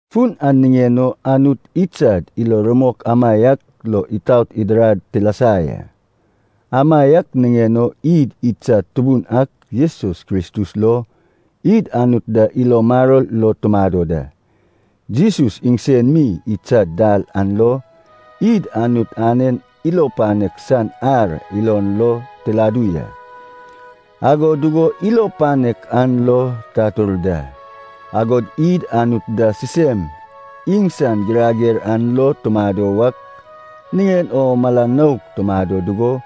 Fun an niŋen o, Anut idsad ilo rumok amaiak lo itaot idirad tilasa ya. Amaiak niŋen o id idsad Tubun ak Jesus Kristus lo id Anut da ilo maror lo tumado da. Jesus iŋsen mi idsad dal an lo, id Anut anen ilo panek san ar ilon lo tiladu ya, agod dugo ilo panek an lo tatur da. Agod id Anut da sisem iŋsan girager an lo tumado wak niŋen o mala nouk tumado dugo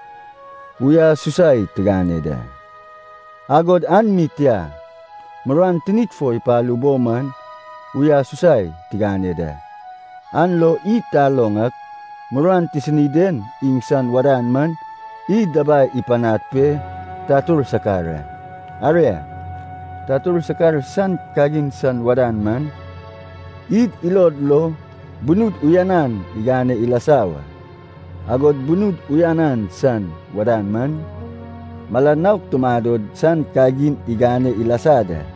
uyasusai tigane da. Agod an mi tia, muruan tinid fo ipalu bo man uyasusai tigane da. An lo id taloŋ ak, muruan tisini den iŋsan wadan man, id dabai ipanad pe tatur sakar a. Aria, tatur sakar san kagin san wadan man, id ilod lo bunud uyanan igane ilasa wa. Agod bunud uyanan san wadan man, mala nouk tumado san kagin igane ilasa da.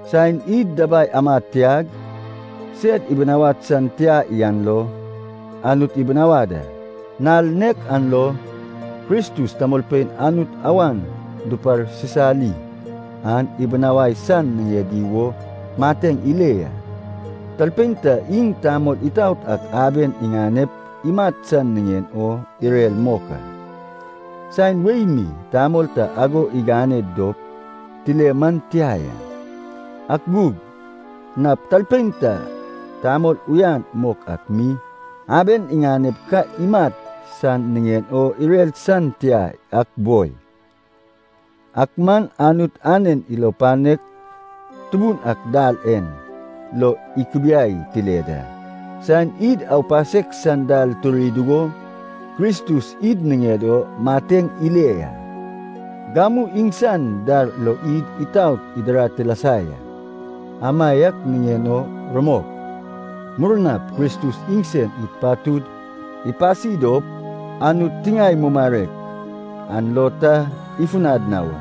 Saen id dabai amad tiag, sed ibinawad san tia yan lo Anut ibinawad a. Nal nek an lo Kristus tamolpein Anut awan duparsisali an ibinawai san niŋedi wo mateŋ ile ya. Talpein ta iŋ tamol itaot ak aben iŋanep imat san niŋen o irer mok a. Saen wei mi tamol ta ago igane dop tile man tia ya. Ak gug, nap talpein ta tamol uyan mok ak mi aben iŋanep ka imat san niŋen o irer san tia yak boi. Ak man Anut anen ilo panek tubun ak dal en lo ikubiai tile da. Saen id aupasek san dal turi dugo Kristus id niŋed o mateŋ ile ya. Gamu iŋsan dar lo id itaot idirad tilasa ya. Amaiak niŋen o rumok, murnap Kristus iŋsen id patud ipasi dop, Anut tiŋae mumarek an lo ta ifunad na wa.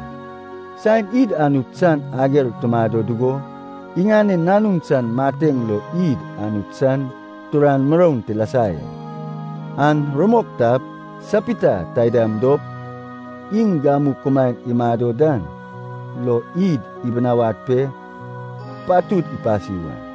Saen id Anut san ager tumado dugo iŋanen Nanun san mateŋ lo id Anut san turan muroun tilasa ya. An rumok tap, sapita taida dop iŋ gamu kumaen imado dan lo id ibinawad pe patud ipasi wa.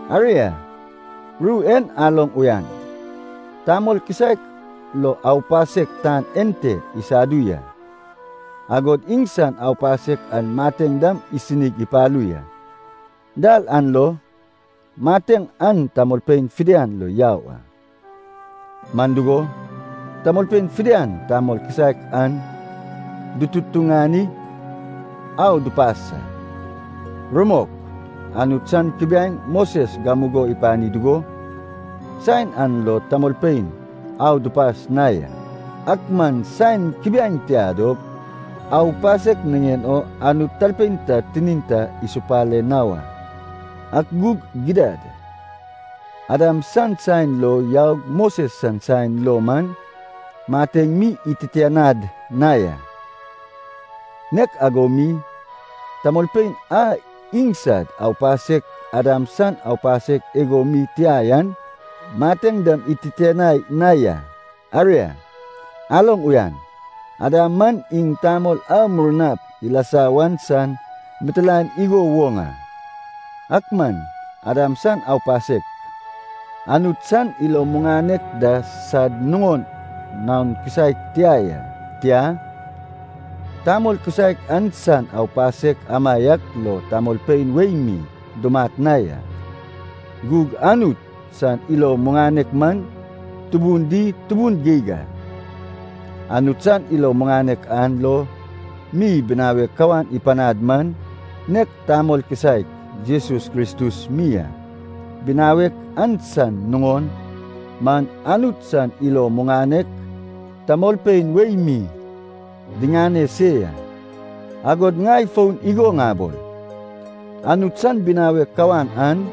Aria, ru en aloŋ uyan. Tamol kisaek lo aupasek tan ente isadu ya. Agod iŋsan aupasek an mateŋ dam isinig ipalu ya. Dal an lo mateŋ an tamolpein fidian lo yau a. Man dugo, tamolpein fidian tamol kisaek an dututuŋanig au dupas a. Rumok, Anut san kubiaeŋ Moses gamugo ipani dugo, saen an lo tamolpein au dupas na ya. Ak man saen kubiaeŋ tia dop, aupasek niŋen o Anut talpein ta tinin ta isupale na wa. Ak gug gidad, Adam san saen lo yaug Moses san saen lo man mateŋ mi ititianad na ya. Nek ago mi, tamolpein a iŋsad aupasek Adam san aupasek igo mi tia yan, mateŋ dam ititianai na ya. Aria, aloŋ uyan, Adam man iŋ Tamol a murnap ilasa wan san mitilaen igo woŋ a. Ak man, Adam san aupasek, Anut san ilo muŋanek da sad nuŋon naon kisaek tia ya. Tia, tamol kisaek an san aupasek amaiak lo tamolpein wei mi dumat na ya. Gug Anut san ilo muŋanek man tubun di tubun geig a. Anut san ilo muŋanek an lo mi binawek kawan ipanad man, nek tamol kisaek Jesus Kristus mi a. Binawek an san nuŋon man Anut san ilo muŋanek tamolpein wei mi diŋane se ya. Agod ŋai fon igo ŋabol, Anut san binawek kawan an,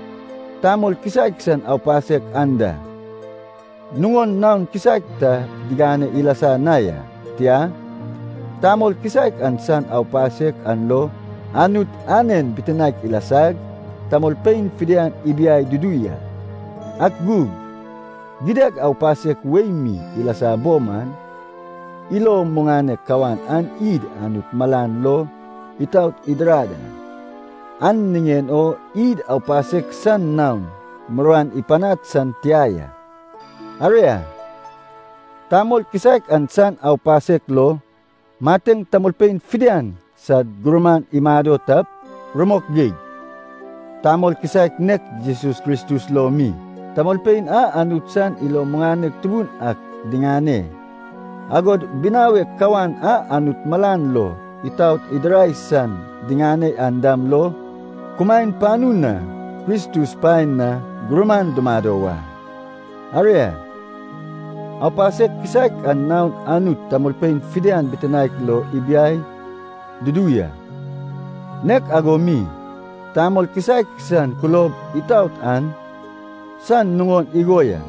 tamol kisaek san aupasek an da, nuŋon naon kisaek ta digane ilasa na ya. Tia, tamol kisaek an san aupasek an lo Anut anen bitinaek ilasag, tamolpein fidian ibiai dudu ya. Ak gug, gidad aupasek wei mi ilasa bo man, ilo muŋanek kawan an id Anut malan lo itaot idirad a, an niŋen o id aupasek san naon muruan ipanad san tia ya. Aria, tamol kisaek an san aupasek lo, mateŋ tamolpein fidian sad gurman imado tap, rumok geig, tamol kisaek nek Jesus Kristus lo mi, tamolpein a Anut san ilo muŋanek tubun ak diŋane, agod binawek kawan a Anut malan lo itaot idirai san diŋane yan dam lo, kumaen panu na Kristus paen na gurman dumado wa. Aria, aupasek kisaek an naon Anut tamolpein fidian bitinaek lo ibiai dudu ya. Nek ago mi, tamol kisaek san kulob itaot an san nuŋon igo ya,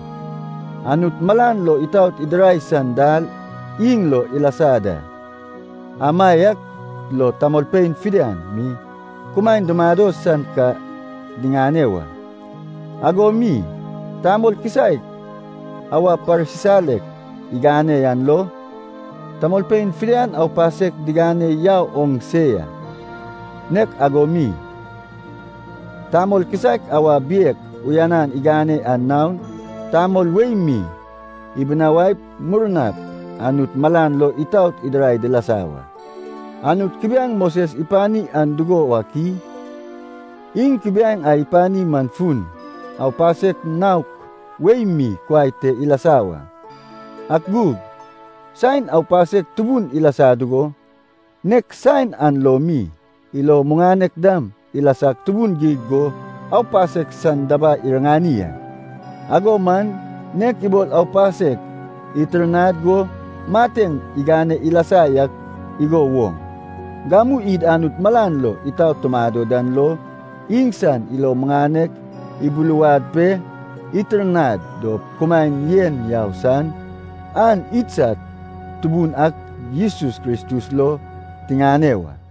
Anut malan lo itaot idirai san dal iŋ lo ilasa da. Amaiak lo tamolpein fidian mi kumaen dumado san ka diŋane wa. Ago mi, tamol kisaek awa parsisalek igane yan lo, tamolpein fidian aupasek digane yau oŋ se ya. Nek ago mi, tamol kisaek awa biek uyanan igane an naon, tamolpein wei mi ibinawaip, murnap Anut malan lo itaot idirai dilasa wa. Anut kubiaeŋ Moses ipani an dugo wak i? Iŋ kubiaeŋ a ipani man fun, aupasek naok wei mi kuai te ilasa wa. Ak gug, saen aupasek tubun ilasa dugo, nek saen an lo mi ilo muŋanek dam ilasag tubun geig go aupasek san dabai iriŋani a. Ago man, nek ibol aupasek itirnad go mateŋ igane ilasa yak igo woŋ, gamu id Anut malan lo itaot tumado dan lo, iŋsan ilo muŋanek ibuluwad pe itirnad dop kumaen yen yau san an idsad Tubun ak Jesus Kristus lo tiŋane wa.